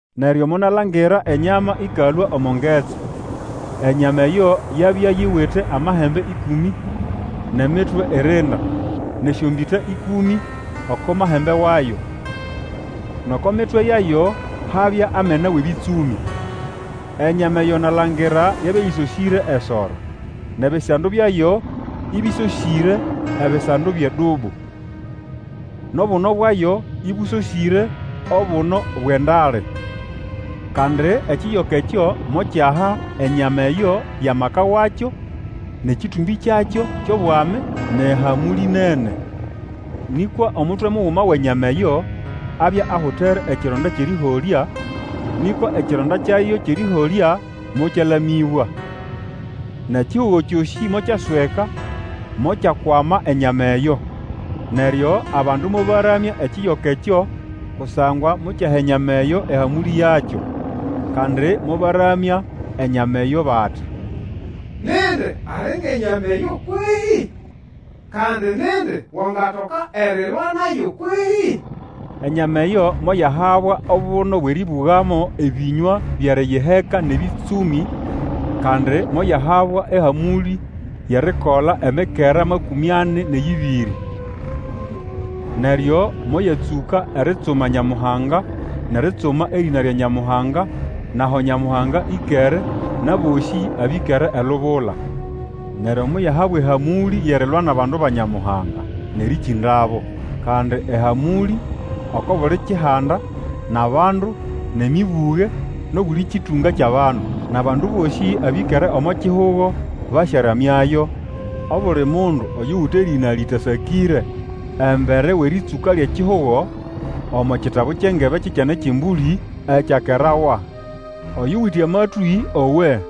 Neryo monalangira enyama ĩkalũa omo ngetsi. Enyama eyo yabya yiwite amahembe ĩkũmĩ nʼemitwe irinda, nʼesyombĩta ĩkũmĩ oko mahembe wayo, nʼoko mitwe yayo habya amena wʼebĩtsũmĩ. Enyama eyo nalangira yabya yĩsosĩre esoro, nʼebisando byayo ĩbĩsosĩre ebisando byʼedubu, nʼobuno bwayo ĩbũsosĩre obuno bwʼendale. Kandi ekiyoka ekyo mokyaha enyama eyo amaka wakyo, nʼekĩtũmbĩ kyakyo kyʼobwami, nʼehamũlĩ nene. Nĩkwa omutwe muguma wʼenyama eyo, abya ahutere ekironda kyʼerĩholya, nĩkwa ekironda kyayo kyʼerĩholya mokyalamĩbwa. Nʼekihugo kyosĩ mokyasweka, mokyakwama enyama eyo. Neryo abandu mobaramya ekiyoka ekyo kusangwa mokyaha enyama eyo ehamũlĩ yakyo. Kandi mobaramya enyama eyo bati, Nindi ali ngʼenyama eyo kwehĩ? Kandi nindi wangatoka erilwa nayo kwehĩ? Enyama eyo moyahabwa obuno bwʼerĩbũgamo ebĩnywa byʼeriyiheka nʼebĩtsũmĩ, kandi moyahabwa ehamũlĩ yʼerikola emikera makũmĩ ani nʼeyĩbĩrĩ. Neryo moyatsũka eritsuma Nyamuhanga, nʼeritsuma erĩna lya Nyamuhanga, nʼaho Nyamuhanga ĩkere, nʼabosĩ abĩkere elubula. Neryo moyahabwa ehamũlĩ yʼerilwa nʼabandu ba Nyamuhanga nʼerĩkĩndabo; kandi ehamũlĩ oko buli kihanda, nʼabandu, nʼemĩbũge, nʼobuli kĩtũnga kyʼabandu. Nʼabandu bosĩ abĩkere omo kihugo basyaramyayo, obuli mundu oyuwite erĩna lĩtasakĩre embere wʼerĩtsũka lyʼekihugo, omo kitabu kyʼengebe kyʼEkyana kyʼEmbũlĩ ekyakerawa. Oyuwite amatwĩ, owe!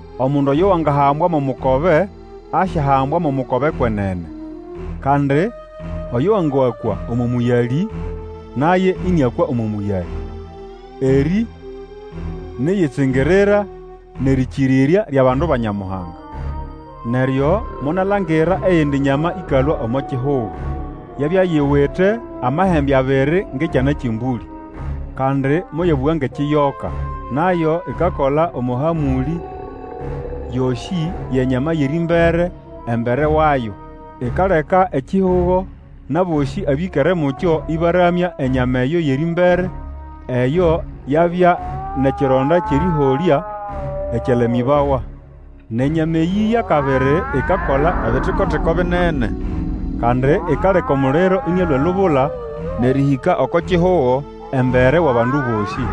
Omundu oyo wangahambwa mo mukobe, asyahambwa mo mukobe kwenene. Kandi oyo wangakwa omo mũyalĩ, naye ĩnĩakwa omo mũyalĩ. Erĩ niʼyitsingirira nʼerĩkĩrĩrya lyʼabandu ba Nyamuhanga. Neryo monalangira eyindi nyama ĩkalũa omo kihugo. Yabya yiwite amahembe abiri ngʼekyana kyʼembũlĩ, kandi moyabũga ngʼekiyoka. Nayo ikakola omo hamũlĩ yosĩ yʼenyama yʼerĩmbere embere wayo. Ikaleka ekihugo nʼabosĩ abĩkere mukyo ĩbaramya enyama eyo yʼerĩmbere eyo yabya nʼekironda kyʼerĩholyayo, ekyalamĩbawa. Nʼenyama eyĩ yʼakabiri ikakola ebitiko-tiko binene. Kandi ikaleka omuliro ĩnĩalũa elubula nʼerĩhĩka oko kihugo embere wʼabandu bosĩ.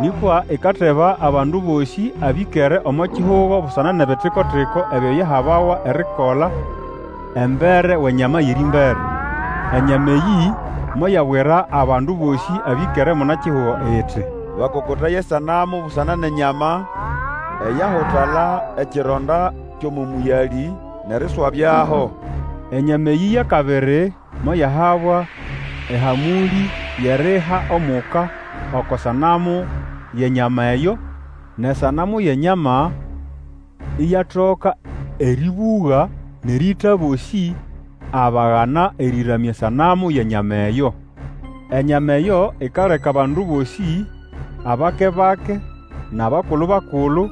Nĩkwa ikateba abandu bosĩ abĩkere omo kihugo busana nʼebitiko-tiko ebyo yahabawa erikola embere wʼenyama yʼerĩmbere. Enyama eyĩ moyabwira abandu bosĩ abĩkere munakihugo iti, bakokotaye esanamu busana nʼenyama eyahutala ekironda kyʼomo mũyalĩ, nʼeriswabyaho. Enyama eyĩ yʼakabiri moyahabwa ehamũlĩ yʼeriha omuka oko sanamu yʼenyama eyo, nʼesanamu yʼenyama iyatoka erĩbũga, nʼerĩĩta abosĩ abagana erĩramya esanamu yʼenyama eyo. Enyama eyo ikaleka abandu bosĩ, abake-bake nʼabakulu-bakulu,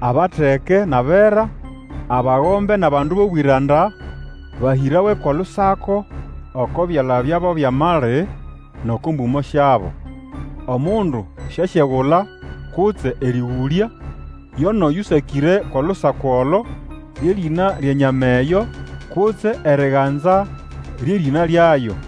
abateke nʼabera, abagombe nʼabandu bʼobwĩranda, bahĩrawe kʼolusako oko byala byabo byʼamali, nʼoko mbũmo syabo. Omundu syasyegula kutse erĩgũlya, yo nʼoyũsakĩre olusako olo, lye rĩna lyʼenyama eyo, kutse eriganza lyʼerĩna lyayo.